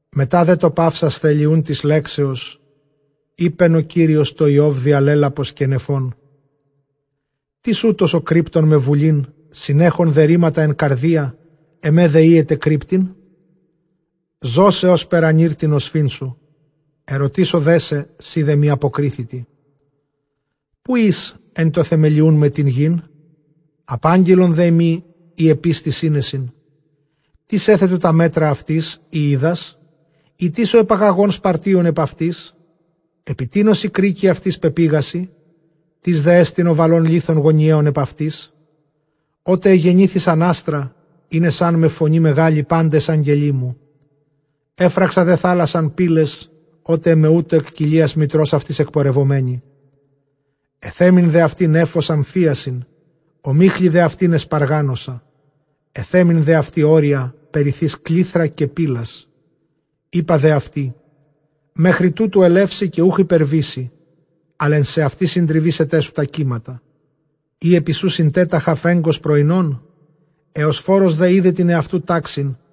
Μετὰ δὲ τὸ παύσασθαι Ἐλιοὺν τῆς λέξεως, εἶπεν ὁ Κύριος τῷ Ἰὼβ διὰ λαίλαπος καὶ νεφῶν, Τίς οὗτος ὁ κρύπτων με βουλὴν, συνέχεν δὲ ῥήματα ἐν καρδίᾳ, ἐμὲ δὲ οἴεται κρύπτειν; Ζώσαι ὥσπερ ἀνὴρ τὴν ὀσφύν σου· ἐρωτήσω δέ σε, σὺ δέ μοι ἀποκρίθητι. Ποῦ ἦς ἐν τῷ θεμελιοῦν με τὴν γῆν; ἀπάγγειλον δέ μοι εἰ ἐπίστῃ σύνεσιν. Τίς ἔθετο τὰ μέτρα αὐτῆς, εἰ οἶδας; ἢ τίς ὁ ἐπαγαγὼν σπαρτίον ἐπʼ αὐτῆς; Ἐπὶ τίνος οἱ κρίκοι αὐτῆς πεπήγασι; τίς δέ ἐστιν ὁ βαλὼν λίθον γωνιαῖον ἐπʼ αὐτῆς; Ὅτε ἐγενήθησαν ἄστρα, ᾔνεσάν με φωνῇ μεγάλῃ πάντες ἄγγελοί μου. Ἔφραξα δὲ θάλασσαν πύλαις, ὅτε ἐμαίμασσεν ἐκ κοιλίας μητρὸς αὐγῆς ἐκπορευομένη· Ἐθέμην δὲ αὐτῇ νέφος ἀμφίασιν, ὁμίχλῃ δὲ αὐτὴν ἐσπαργάνωσα. Ἐθέμην δὲ αὐτῇ ὅρια, περιθεὶς κλεῖθρα καὶ πύλας. Εἶπα δὲ αὐτῇ, μέχρι τούτου ἐλεύσῃ, καὶ οὐχ ὑπερβήσῃ, ἀλλʼ ἐν σεαυτῇ συντριβήσεταί σου τὰ κύματα. Ἢ ἐπὶ σοῦ συντέταχα φέγγος πρωϊνόν; Ἑωσφόρος δὲ ἶδε τὴν ἑαυτοῦ τάξιν,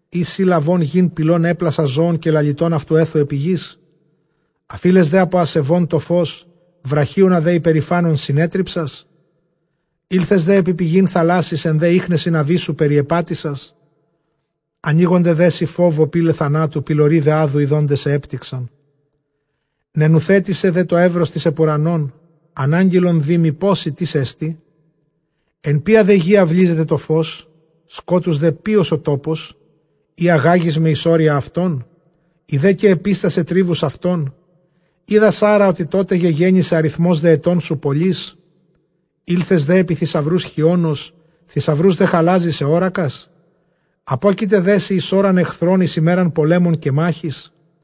Ἢ σὺ λαβὼν γῆν πηλὸν, ἔπλασας ζῶον, καὶ λαλητὸν αὐτὸν ἔθου ἐπὶ γῆς; Ἀφεῖλες δὲ ἀπὸ ἀσεβῶν τὸ φῶς, βραχίονα δὲ ὑπερηφάνων συνέτριψας; Ἦλθες δὲ ἐπὶ πηγὴν θαλάσσης, ἐν δὲ ἴχνεσιν ἀβύσσου περιεπάτησας; Ἀνοίγονται δέ σοι φόβῳ πύλαι θανάτου, πυλωροὶ δὲ ᾅδου ἰδόντες σε ἔπτηξαν; Νενουθέτησαι δὲ τὸ εὖρος τῆς ὑπʼ οὐρανόν; ἀνάγγειλον δή μοι, πόση τίς ἐστι; Ποίᾳ δὲ γῇ αὐλίζεται τὸ φῶς; σκότους δὲ ποῖος ὁ τόπος; Εἰ ἀγάγοις με εἰς ὅρια αὐτῶν, εἰ δὲ καὶ ἐπίστασαι τρίβους αὐτῶν· Οἶδα ἄρα ὅτι τότε γεγέννησαι, ἀριθμὸς δὲ ἐτῶν σου πολύς; Ἦλθες δὲ ἐπὶ θησαυροὺς χιόνος, θησαυροὺς δὲ χαλάζης ἑώρακας; Ἀπόκειται δέ σοι εἰς ὥραν ἐχθρῶν, εἰς ἡμέραν πολέμων καὶ μάχης;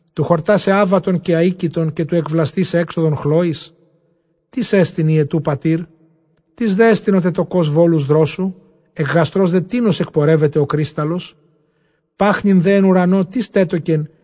τοῦ χορτάσαι ἄβατον καὶ ἀοίκητον, καὶ τοῦ ἐκβλαστῆσαι ἔξοδον χλόης; Τίς ἐστιν ὑετοῦ πατήρ; τίς δέ ἐστιν ὁ τετοκὼς βώλους δρόσου; Ἐκ γαστρὸς δὲ τίνος ἐκπορεύεται ὁ κρύσταλλος; πάχνην δὲ ἐν οὐρανῷ τίς τέτοκεν,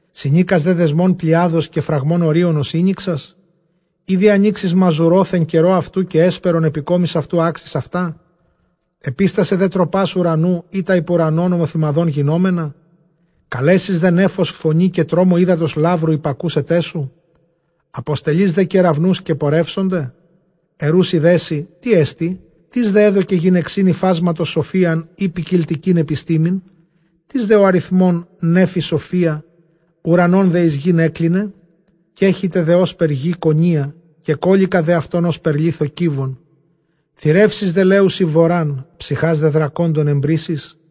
Συνῆκας δὲ δεσμὸν Πλειάδος, καὶ φραγμὸν Ὠρίωνος ἤνοιξας; Ἢ διανοίξεις μαζουρὼθ ἐν καιρῷ αὐτοῦ, καὶ ἕσπερον ἐπὶ κόμης αὐτοῦ ἄξεις αὐτά; Ἐπίστασαι δὲ τροπὰς οὐρανοῦ, ἢ τὰ ὑπʼ οὐρανὸν ὁμοθυμαδὸν γινόμενα; καλέσεις δὲ νέφος φωνῇ, καὶ τρόμῳ ὕδατος λάβρου ὑπακούσεταί σου; Ἀποστελεῖς δὲ κεραυνοὺς καὶ πορεύσονται; ἐροῦσι δέ σοι, τί ἐστι; Τίς δὲ ἔδωκε γυναιξὶν ὑφάσματος σοφίαν, ἢ ποικιλτικὴν ἐπιστήμην; Τίς δὲ ὁ ἀριθμῶν νέφη σοφίᾳ, οὐρανὸν δὲ εἰς γῆν ἔκλινε; Κέχυται δὲ ὥσπερ γῆ κονία, κεκόλληκα δὲ αὐτὸν ὥσπερ λίθῳ κύβον. Θηρεύσεις δὲ λέουσι βορὰν, ψυχὰς δὲ δρακόντων ἐμπλήσεις;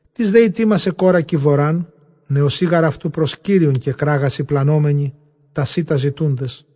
Τίς δὲ ἡτοίμασε κόρακι βοράν; νεοσσοὶ γὰρ αὐτοῦ πρὸς Κύριον κεκράγασι πλανώμενοι, τὰ σῖτα ζητοῦντες.